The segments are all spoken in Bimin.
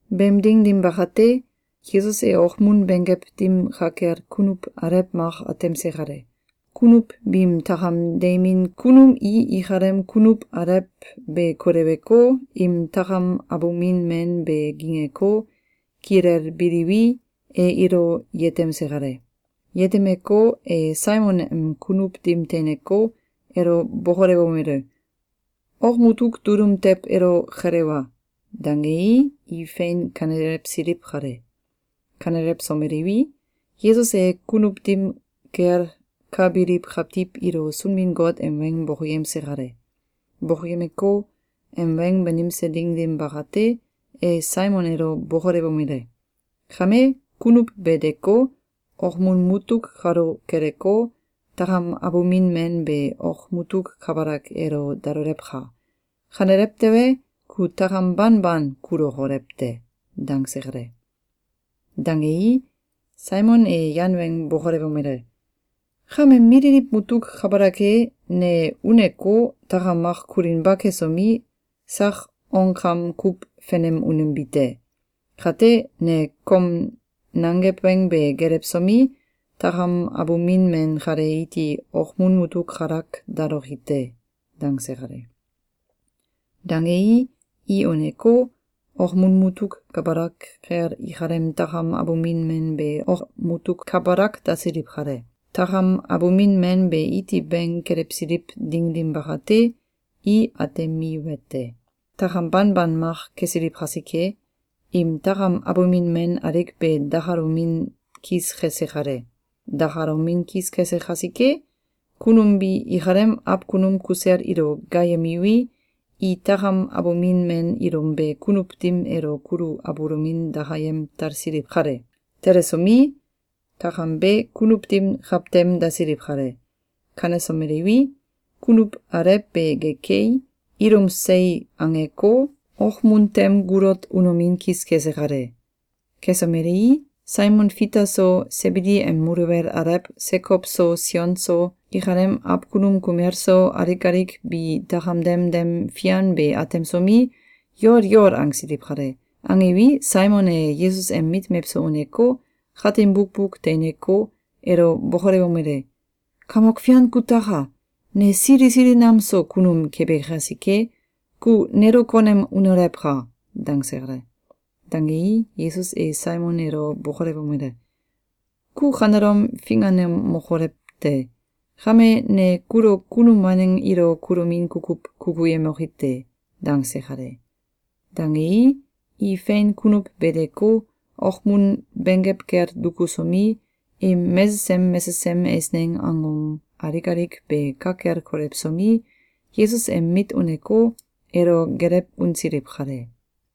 Beem ding dim bakate, Yesus e okmun benggew dim ka kel kunuw alew mak atemse kale. Kunuw biim takam deimin kunum i ikalem kunuw alew be koleweko, im takam abumin men be gingeko, kilelbiliwi, e ilo yetemse kale. Yetemeko, e Saimon em kunuw dim teineko, elo bokolewomele: “Ok mutuk dulum tew elo kelewa!”, dangei, i fein kanelewsiliw kale. Kanelewsomeliwi, Yesus e kunuw dim kel ka biliw kawtiw ilo Sunbin-Got em weng bokoyemse kale. Bokoyemeko, em weng banimse ding dim bakate, e Saimon elo bokolewomele: “Kame, kunuw be deko, okmun mutuk kalo keleko, takam abumin men be ok mutuk kabalak elo dalolewka! Kanelew tewe, ku takam banban kulokolew te!”, dangse kale. Dangei, Saimon e yan weng bokolewomele: “Kame mililiw mutuk kabalak e, ne uneko, takam mak kulinba kesomi, sak onkam kuw fenem unembi te. Kate, ne kom nangew weng be gelewsomi, takam abumin men kale iti okmun mutuk kalak daloki te.”, dangse kale. Dangei, i uneko, okmun mutuk kabalak kel ikalem takam abumin men be ok mutuk kabalak dasiliw kale. Takam abumin men be iti bing kelewsiliw ding dim bakate, i atemiwete: Takam ban ban mak kesiliw kasike, im takam abumin men alik be dakalomin kis kese kale. Dakalomin kis kese kasike, kunum bi ikalem awkunum kusel ilo gaayemiwi, i takam abumin men ilum be kunuw dim elo kulu abulomin dakayem talsiliw kale. Telesomi, takam be kunuw dim kawtem dasiliw kale. Kanesomeliwi, kunuw alew be gekei, ilum sei angeko, okmun tem gulot unomin kis kese kale. Kesomelei, Saimon Fita so, Sebidi em muluwel alew Sekow so Sion so, ikalem awkunum kumel so, alik alik bi takam dem dem fian be atemsomi, yol yol angsiliw kale. Angiwi, Saimon e Yesus em mit mewso uneko, katin bukbuk teineko, elo bokolewomele: “Kamok Fian kutaka! Ne sili sili nam so kunum kebi kasike, ku nelo konem unolewka!”, dangse kale. Dangei, Yesus e Saimon elo bokolewomele: “Ku kanelom finganemokolew te! Kame, ne kulo kunum waneng ilo kulomin kukuw kukuyemoki te.”, dangse kale. Dangei, i fein kunuw be deko, okmun benggew kel dukusomi, im mesesem mesesem eisneng angom alik alik be ka kel kolewsomi, Yesus em mit uneko, elo gelew unsiliw kale.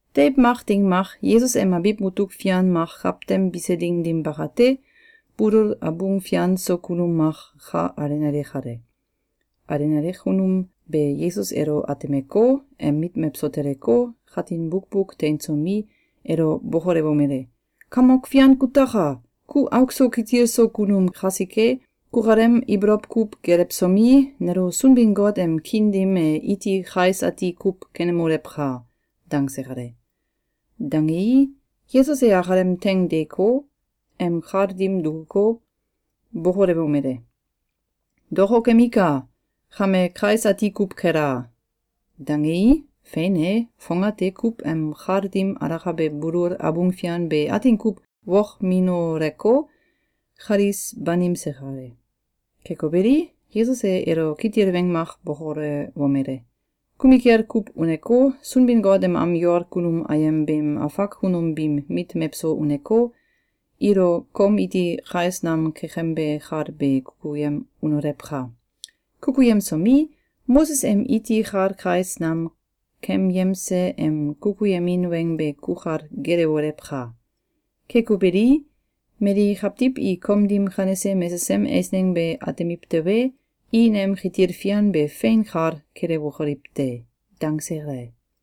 Deiw mak ding mak, Yesus em abiw mutuk fian mak kawtem bise ding dim bakate, bulul abung fian so kunum mak ka alenale kale. Alenale kunum be Yesus elo atemeko, em mit mewso teleko, katin bukbuk teinsomi, elo bokolewomele: “Kamok Fian kutaka! Ku auk so kitil so kunum kasike, kukalem ibolow kuw gelewsomi, nelo Sunbin-Got em kiin dim e iti kais ati kuw kenemolewka!”, dangse kale. Dangei, Yesus e akalem teing deeko, em kal dim dukuko, bokolewomele: “Dokokemika! Kame kais ati kuw kela!”, dangei, fein e, fongate kuw em kal dim alakabe bulul abung fian be atin kuw wokminoleko, kalis banimse kale. Keko beli, Yesus e elo kitil weng mak bokolewomele: “Kumikel kuw uneko, Sunbin-Got em am yol kunum ayem beem afak kunum biim mit mewso uneko, ilo kom iti kais nam kekembe kal be kukuyem unolewka! Kukuyemsomi, Moses em iti kal kais nam kemyemse em kukuyemin weng be kukal gelewolewka! Keko beli, mali kawtiw i kom dim kanese mesesem eisneng be atemiw tewe, i nem kitil fian be fein kal kelewokoliw te.”, dangse kale.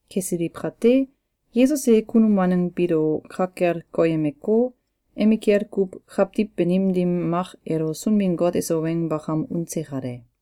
Kesiliw kate, Yesus e kunum waneng biilo ka kel koyemeko, emikel kuw kawtiw banim dim mak elo Sunbin-Got eso weng bakam unse kale.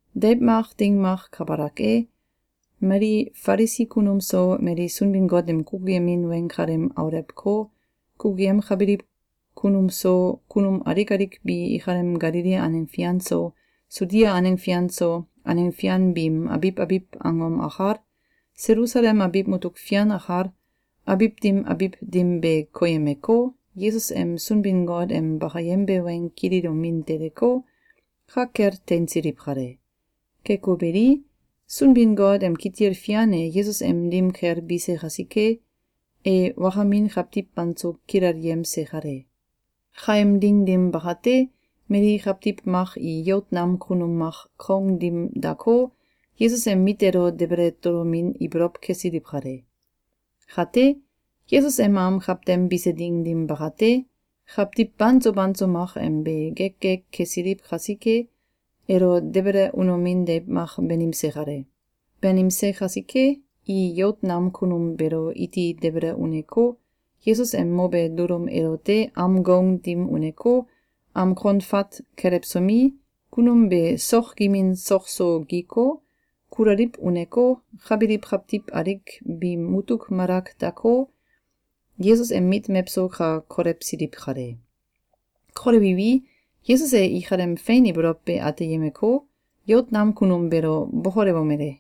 Deiw mak ding mak kabalak e, mali Falisi kunum so, mali Sunbin-Got em kukuyemin weng kalem aulewko, kukuyemkabiliw kunum so, kunum alik alik bi ikalem Galili aneng fian so, Sudia aneng fian so, aneng fian biim abiw abiw angom akal, Selusalem abiw mutuk fian akal, abiw dim abiw dim be koyemeko, Yesus em Sunbin-Got em bakayembe weng kililomin teleko, ka kel teinsiliw kale. Keko beli, Sunbin-Got em kitil fian e Yesus em dim kel bise kasike, e wakamin kawtiw banso kilelyemse kale. Kaem ding dim bakate, mali kawtiw mak i yout nam kunum mak kaung dim dako, Yesus em mit elo debele tolomin ibolow kesiliw kale. Kate, Yesus em am kawtem bise ding dim bakate, kawtiw banso banso mak am be gek gek kesiliw kasike, elo debele unomin deiw mak banimse kale. Banimse kasike, i yout nam kunum beelo iti debele uneko, Yesus em mobe dulum elote am goung dim uneko, am kon fat kelewsomi, kunum be sok gimin sok so giko, kulaliw uneko, ka biliw kawtiw alik biim mutuk malak dako, Yesus em mit mewso ka kolewsiliw kale. Kolewiwi, Yesus e ikalem fein ibolow be ateyemeko, yout nam kunum beelo bokolewomele: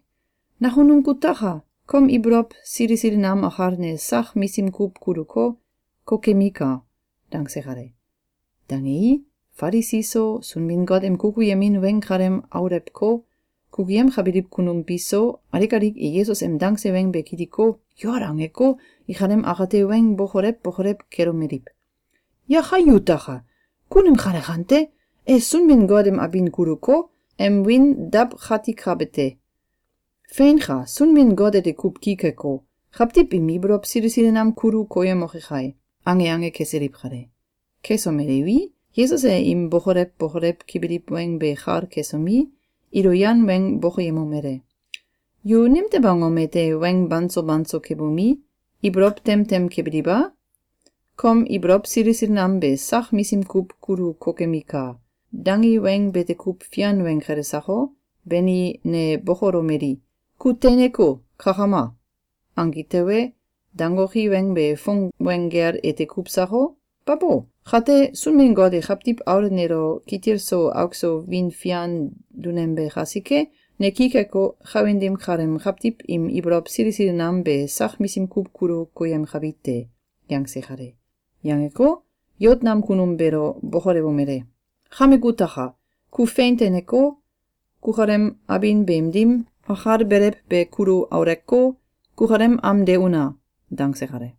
“Nakunum kutaka! Kom ibolow sili sili nam akal ne sak misim kuw kuluko, kokemika.”, dangse kale. Dangei, Falisi so, Sunbin-Got em kukuyemin weng kalem aulewko, kukuyemkabiliw kunum bi so, alik alik i Yesus em dangse weng be kiliko, yol angeko, ikalem akate weng bokolew bokolew kelomeliw: “Yakai yutaka! Kunum kale kante? E Sunbin-Got em abin kuluko, em wiin dawkatikabe te! Feinka! Sunbin-Got ete kuw ki keko, kawtiw im ibolow sili sili nam kulu koyemoke kai!”, ange ange kesiliw kale. Kesomeliwi, Yesus e im bokolew bokolew kebiliw weng be kal kesomi, ilo yan weng bokoyemomele: “Yu nimtew angom ete weng banso banso kebomi, ibolow tem tem kebiliw a? ‘Kom ibolow sili sili nam be sak misim kuw kulu kokemika!’, dangi weng bete kuw fian weng kele sako? Bani, ne bokolomeli: ‘Ku teineko, kakama!’, angi tewe, dangoki weng be fong weng gel ete kuw sako? Babo! Kate, Sunbin-Got e Kawtiw Aul nelo kitil so auk so wiin fian dunembe kasike, ne ki keko, kawin dim kaleem kawtiw im ibolow sili sili nam be sak misim kuw kulu koyemkabi te.”, yangse kale. Yangeko, yout nam kunum beelo bokolewomele: “Kame kutaka! Ku fein teineko, kukalem abin beem dim akalbelew be kulu auleko, kukalem am de una!”, dangse kale.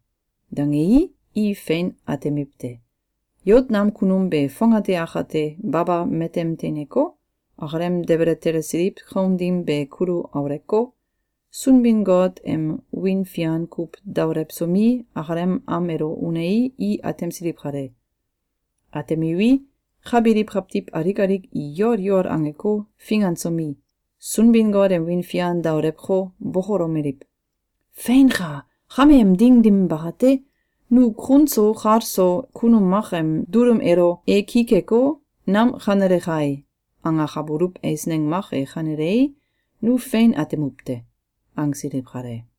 Dangei, i fein atemiwte: Yout nam kunum be fongate akate baba matem teineko, akalem debele telesiliw kaung dim be kulu auleko, Sunbin-Got em wiin fian kuw daolewsomi, akalem am elo unei, i atemsiliw kale. Atemiwi, ka biliw kawtiw alik alik i yol yol angeko, fingansomi, Sunbin-Got em wiin fian daolewko, bokolomeliw: “Feinka! Kame em ding dim bakate, nu kun so kal so kunum mak em dulum elo ‘E ki keko, nam kanele kai!’, angakabuluw eisneng mak e kanelei, nu fein atemuw te.”, angsiliw kale.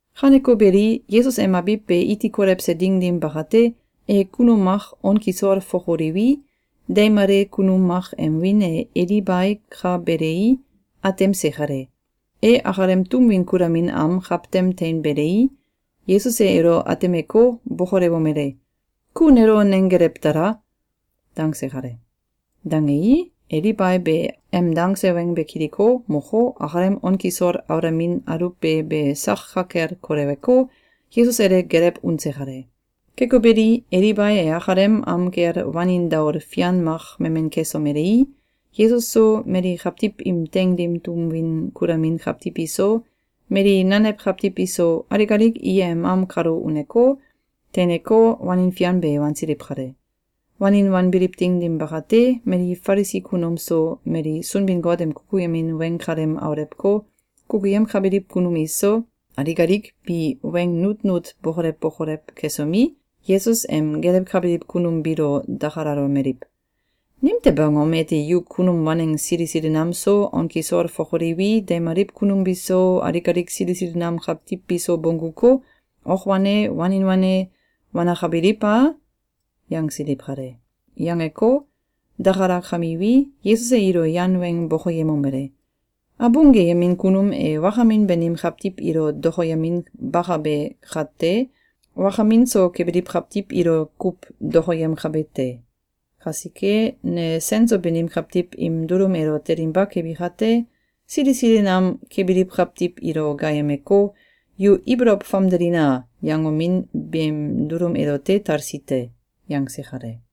Kaneko beli, Yesus em abiw be iti kolewse ding dim bakate, e kunum mak on kisol fokoliwi, deimale kunum mak em wiin e Elibai ka belei, atemse kale. E akalem tum win kulamin am kawtem teinbelei, Yesus e elo atemeko, bokolewomele: “Ku nelo nenggelew tala!”, dangse kale. Dangei, Elibai be em dangse weng be kiliko, moko, akalem on kisol aulamin aluwbe be sak ka kel koleweko, Yesus elo gelew unse kale. Keko beli, Elibai e akalem am kel wanin daol fian mak memen kesomelei, Yesus so, mali kawtiw im teing dim tum win kulamin kawtiw iso, mali nanew kawtiw iso, alik alik i em am kalo uneko, teineko, wanin fian be wansiliw kale. Wanin wanbiliw ding dim bakate, mali Falisi kunum so, mali Sunbin-Got em kukuyemin weng kalem aulewko, kukuyemkabiliw kunum iso, alik alik bi weng nutnut bokolew bokolew kesomi, Yesus em gelewkabiliw kunum biilo dakalalomeliw: “Nimtew angom ete yu kunum waneng sili sili nam so, on kisol fokoliwi, deimaliw kunum biso, alik alik sili sili nam kawtiw biso bongguko, ok wane, wanin wane wanakabilw a?”, yangsiliw kale. Yangeko, dakalakamiwi, Yesus e ilo yan weng bokoyemomele: “Abung geyembin kunum e wakamin banim kawtiw ilo dokoyeminbakabe kate, wakamin so kebiliw kawtiw ilo kuw dokoyemkabe te. Kasike ne sen so banim kawtiw im dulum elo telinba kebi kate, sili sili nam kebiliw kawtiw ilo gaayemeko, ‘Yu ibolow famdelina!’, yangomin beem dulum elote talsi te.”, yangse kale.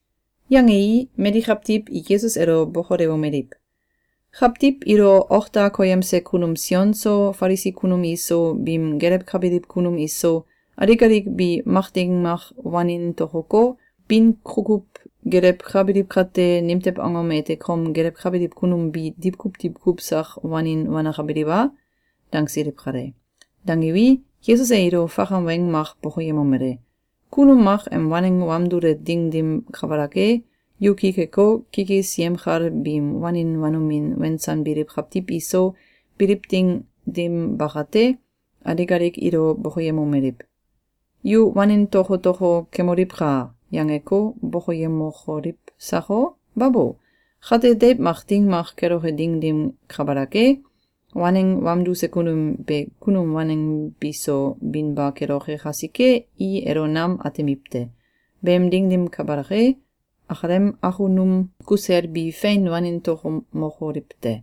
Yangei, mali kawtiw i Yesus elo bokolewomeliw: “Kawtiw ilo ok da koyemse kunum Sion so, Falisi kunum iso, biim gelewkabiliw kunum iso, alik alik bi mak ding mak wanin tokoko, bin kukuw gelewkabiliw kate, nimtew angom ete kom gelewkabiliw kunum bi diwkuw diwkuw sak wanin wanakabiliw a?”, dangsiliw kale. Dangiwi, Yesus e ilo fakam weng mak bokoyemomele: “Kunum mak em waneng wamdule ding dim kabalak e, yu ki keko, kikis yemkal biim wanin wanomin wensanbiliw kawtiw iso biliw ding dim bakate, alik alik ilo bokoyemomeliw: ‘Yu wanin tokotoko kemoliwka!’, yangeko bokoyemokoliw sako? Babo! Kate deiw mak ding mak keloke ding dim kabalak e, waneng wamduse kunum be kunum waneng biso binba keloke kasike, i elo nam atemiw te. Beem ding dim kabalak e, akalem akunum kusel bi fein wanin tokomokoliw te.”,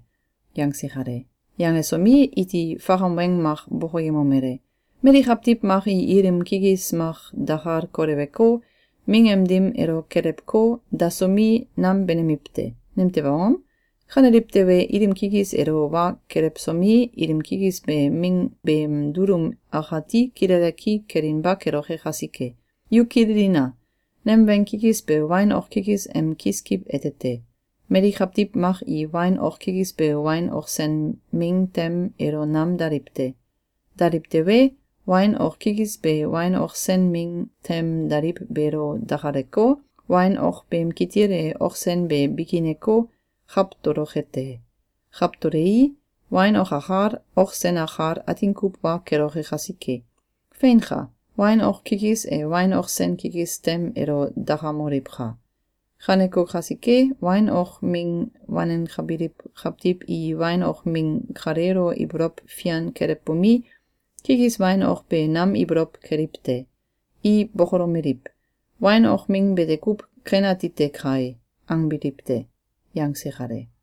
yangse kale. Yangesomi, iti fakam weng mak bokoyemomele: “Mali kawtiw mak i ilim kikis mak dakal koleweko, ming em dim elo kelewko, dasomi, nam benemiw te. Nimtew angom? Kaneliw tewe, ilim kikis elo wa kelewsomi, ilim kikis be ming beem dulum akati kilele ki kelinba keloke kasike. Yu kililina! Nem weng kikis be wain ok kikis em kiskiw ete te. Mali kawtiw mak i wain ok kikis be wain ok sen ming tem elo nam daliw te. Daliw tewe, wain ok kikis be wain ok sen ming tem daliw beelo dakaleko, wain ok beem kitil e ok sen be bikineko, kawtoloke te. Kawtolei, wain ok akal, ok sen akal atin kuw wa keloke kasike. Feinka! Wain ok kikis e wain ok sen kikis tem elo dakamoliwka! Kaneko kasike, wain ok ming wanenkabiliw kawtiw i wain ok ming kaleelo ibolow fian kelewbomi, kikis wain ok be nam ibolow keliw te. I bokolomeliw: ‘Wain ok ming bete kuw ken atite kai!’, angbiliw te.”, yangse kale.